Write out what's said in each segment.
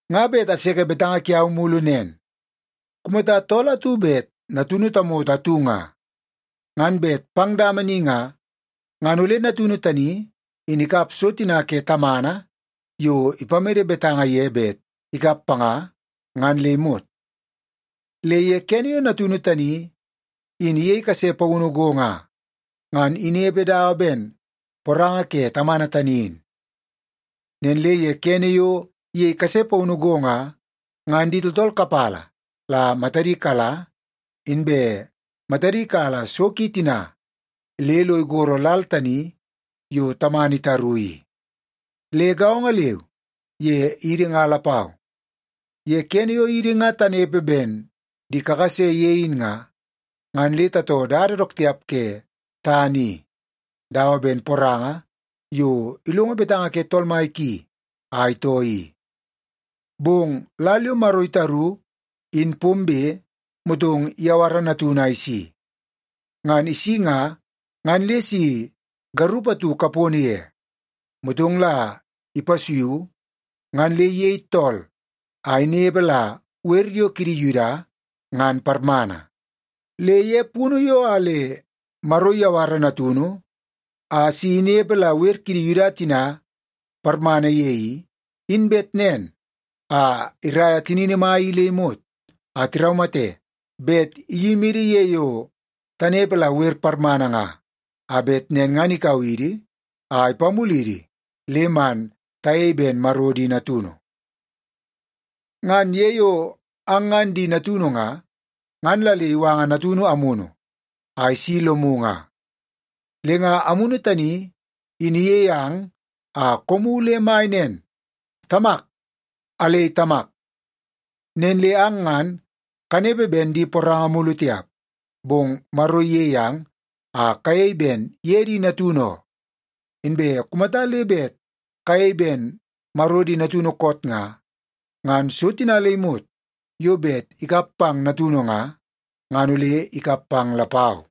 Nga bet aseke betanga kiau mulu nen. Kumata tool atu bet natunu tamoto atu nga, ngan bet pang dama ni nga, ngan ole natunu tani in ikap so tina ke tamana yo ipamede betanga ye bet ikap panga, ngan le imot. Le ye kene yo natunu tani in iyei kase paunu go nga, ngan inepe dawa ben poranga ke tamana tani in. Nen le ye kene yo iyei kase paunu go nga, ngan di tooltool kapala la matadi kala, inbe matadi kala so ki tina le lo igoro lal tani yo tamana itaru i. Le gaongo leu ye idi nga lapau, ye kene yo idi nga tanepe ben di kakase ye in nga, ngan le tatoo dada dook tiap ke tana i dawa ben poranga yo ilongo betanga ke tool mai ki a itoo i. Bong lal yo Maro itaru, in pombe, motong iyawara Natunu a isi. Ngan isi nga, ngan le si garup atu kapono ye, motong la ipasuiu ngan le iyei tool a inepe la wer yo kidi Yuda ngan parmana. Le ye punu yo a le Maro iyawara Natunu a si inepe la wer kidi Yuda tina parmana ye i, in bet nen a iraia tinini mai i le imot a tiraumate bet iyimidi ye yo tanepe la wer parmana nga, a bet nen ngan ikau idi a ipamulidi le man tayei ben Maro di natunu. Ngan ye yo ang ngan di natunu nga, ngan la le iwanga Natunu Amunu a isi lomu nga. Le nga Amunu tani in iyei ang a koomu le mai nen, “Tamak, alei Tamak.” Nen le ang ngan kanepe ben di poranga mulu tiap, bong Maro iyei ang a kayei ben ye di natunu oo. Inbe kumata le bet kayei ben Maro di natunu koot nga, ngan so tina le imot yo bet ikap pang natunu nga, ngan ole ikap pang lapau.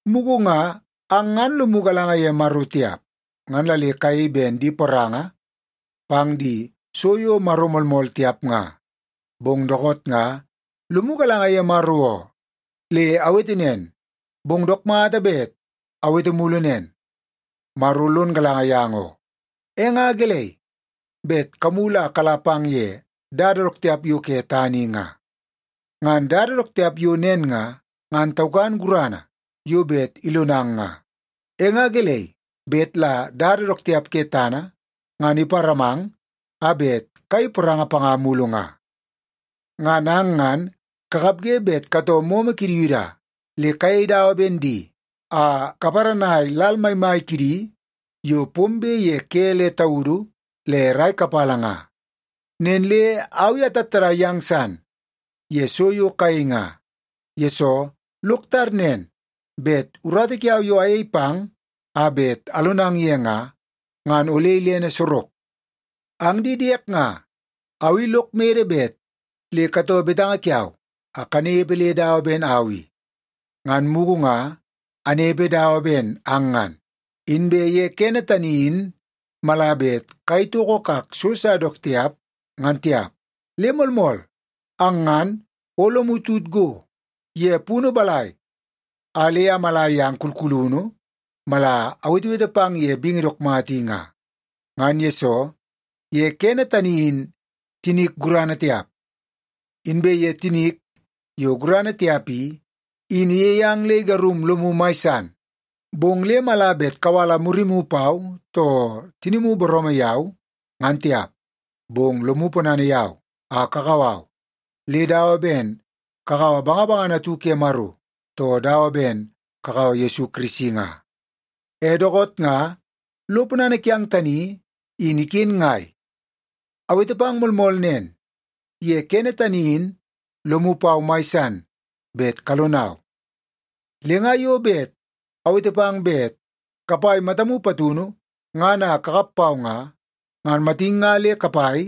Mugu nga ang ngan lomu galanga ye Maro tiap, ngan la le kayei ben di poranga pang di so yo maro moolmool tiap nga. Bong dookoot nga lomu galanga ye Maro oo. Le awete nen, bong dook mata bet awete mulu nen, Maro lon galanga yang oo. E nga gelei bet kamulu a kala pang ye dada dook tiap yo ke tana i nga? Ngan dada dook tiap yo nen nga, ngan taukan gurana yo bet ilonang nga. E nga gelei bet la dada dook tiap ke tana ngan iparamang a bet kayei poranga panga mulu nga? Ngan ang ngan kakapge bet katoo momo kidi Yuda le kayei dawa ben di a kaparanai lal maimai kidi yo pombe ye ke le taudu le rai kapala nga. Nen le au i atattadai yang san ye so yo kayei nga, yesoo lok tar nen bet urata kiau yo ayei pang a bet alonang ye nga, ngan ole ilene sorok. Ang di diek nga, au i lok mede bet le katoo betanga kiau a kanepe le dawa ben au i. Ngan mugu nga anepe dawa ben ang ngan, inbe ye kene tani in mala bet kayei toko kak so sa dook tiap, ngan tiap. Le moolmool, ang ngan o lomu tut go ye punu balai a le amala yang kulkulunu mala awetewete pang ye bingi dook mata i nga. Ngan yesoo, ye kene tani in tinik gurana tiap. Inbe ye tinik yo gurana tiap i, in iyei ang le igarung lomu mai san. Bong le mala bet kawala murimu pau, too tinimu booroomoo yau, ngan tiap. Bong lomu ponana yau a kakau au le dawa ben kakaua bangabangana atu ke Maro, too dawa ben kakaua Yesu Kirisi nga. E dookoot nga lo ponana kiang tani in iken ngai? Awete pang moolmool nen, ye kene tani in lomu pau mai san bet kalonau. Le nga yo bet awete pang bet kapai matamu patunu ngan a kakap pau nga, ngan matin nga le kapai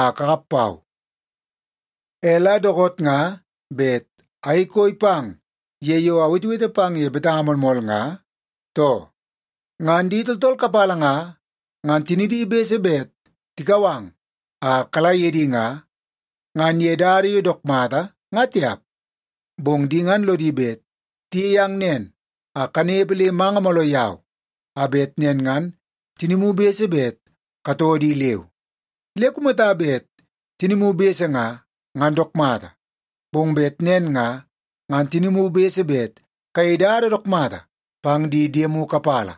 a kakap pau. E la dookoot nga bet ayei koi pang ye yo awetewete pang ye betanga moolmool nga, too? Ngan di tooltool kapala nga, ngan tinidi bese bet tikau ang a kala ye di nga, ngan ye dada yo dook mata nga tiap. Bong di ngan lodi bet tiyei ang nen a kanepe le manga mooloo yau, a bet nen ngan tinimu bese bet katoo di leu. Le kumata bet tinimu bese nga, ngan dook mata, bong bet nen nga, ngan tinimu bese bet kayei dada dook mata pang di diemu kapala.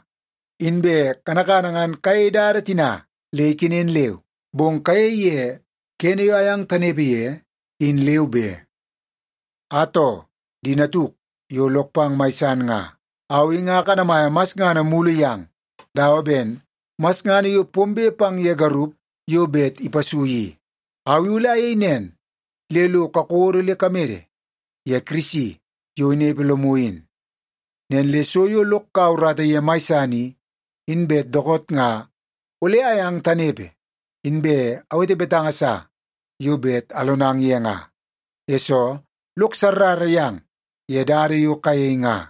Inbe kanakana ngan kayei dada tina le ikenen leu, bong kayei ye kene yo ayang tanepe ye in leu be. Atoo, di natuk yo lok pang mai san nga, au i nga akanamaia masngana mulu yang dawa ben masngana yo pombe pang ye garup yo bet ipasui i. Au i ole ayei nen le lo kakodo le kamede ye Kirisi yo inepe lomu in. Nen le so yo lok kaua urata ye mai san i, in bet dookoot nga ole ayang tanepe, inbe awete betanga sa yo bet alonang ye nga, yesoo lok sarrara yang ye dada yo kayei nga.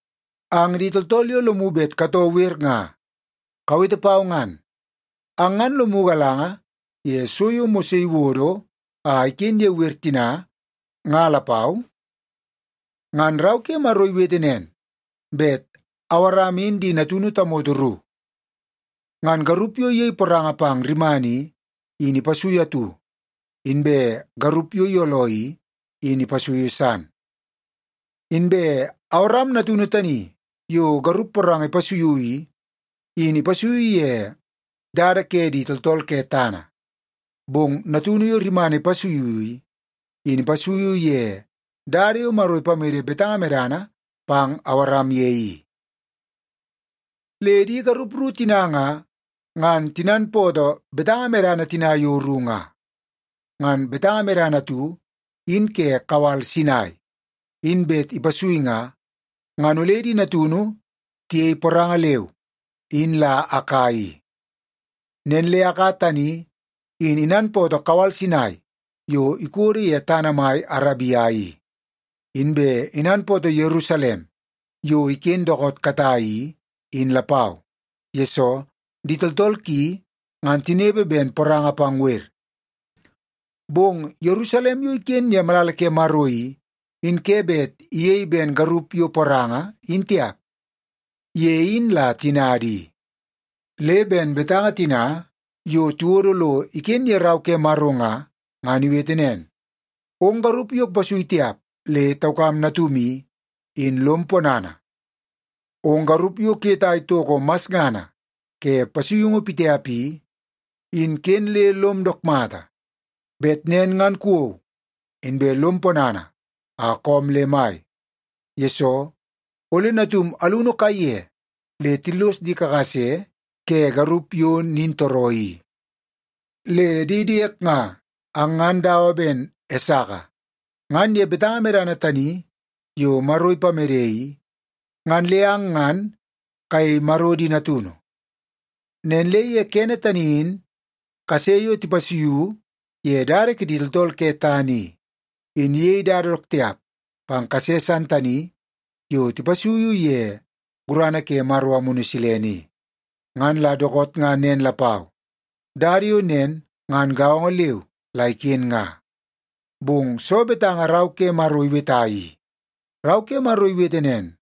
Ang di tooltool yo lomu bet katoo wer nga, kawete pau ngan. Ang ngan lomu galanga ye so yo Mose iwodo a iken ye wer tina nga lapau? Ngan Rau ke Maro iwete nen bet Awaram in di natunu tamoto ru. Ngan garup yo iyei poranga pang rimana i, in ipasuiu atu, inbe garup yo iyooloo i, in ipasuiu san. Inbe Awaram natunu tani yo garup poranga ipasuiu i, in ipasuiu ye dada ke di tooltool ke tana. Bong natunu yo rimana ipasuiu i, in ipasuiu ye dada yo Maro ipamede betanga medana pang Awaram ye i. Le di garup ru tina nga, ngan tinanpootoo betanga medana tina yo ru nga. Ngan betanga medana atu in ke kawal Sinai, in bet ipasui nga, ngan ole di natunu tiyei poranga leu, in la Aka i. Nen le Aka tani in inanpootoo kawal Sinai yo ikodo ye tana mai Arabia i. Inbe inanpootoo Yerusalem yo iken dookoot katai i, in lapau, yesoo di tooltool ki ngan tinepe ben poranga pang wer. Bong Yerusalem yo iken ye malala ke Maro i, in ke bet iyei ben garup yo poranga in tiap. Ye in la tinada i. Le ben betanga tina yo tiwodo lo iken ye Rau ke Maro nga, ngan iwete nen, “Ong garup yo kupasui tiap le taukam natum i, in lom ponana. Ong garup yo kuyetai toko masngana ke pasuiungu pitiap i, in ken le lom dook mata. Bet nen ngan kuwou, inbe lom ponana a koom le mai, yesoo ole natum alunu kaiye le tillos di kakase ke garup yo nintooroo i.” Le di diek nga, ang ngan dawa ben Esaka. Ngan ye betanga medana tani yo Maro ipamede i, ngan le ang ngan kayei Maro di natunu. Nen le ye kene tani in kase yo tipasuiu ye dada kidi tooltool ke tana i, in iyei dada dook tiap pang kase san tani yo tipasuiu ye gurana ke Maro Amunu Silene i. Ngan la dookoot nga nen lapau, dada yo nen ngan gaongo leu la iken nga. Bong soo betanga Rau ke Maro iweta i? Rau ke Maro iwete nen,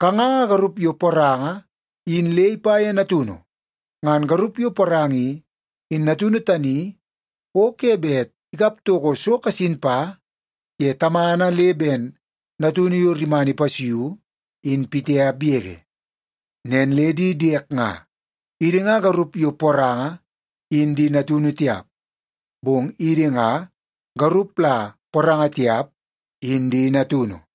“Kanganga garup yo poranga in le ipa ye natunu. Ngan garup yo poranga i, in natunu tani o ke bet ikap toko so kasin pa ye tamana le ben natunu yo rimana ipasuiu, in pitiap yege.” Nen le di diek nga, idi nga garup yo poranga in di natunu tiap, bong idi nga garup la poranga tiap in di natunu.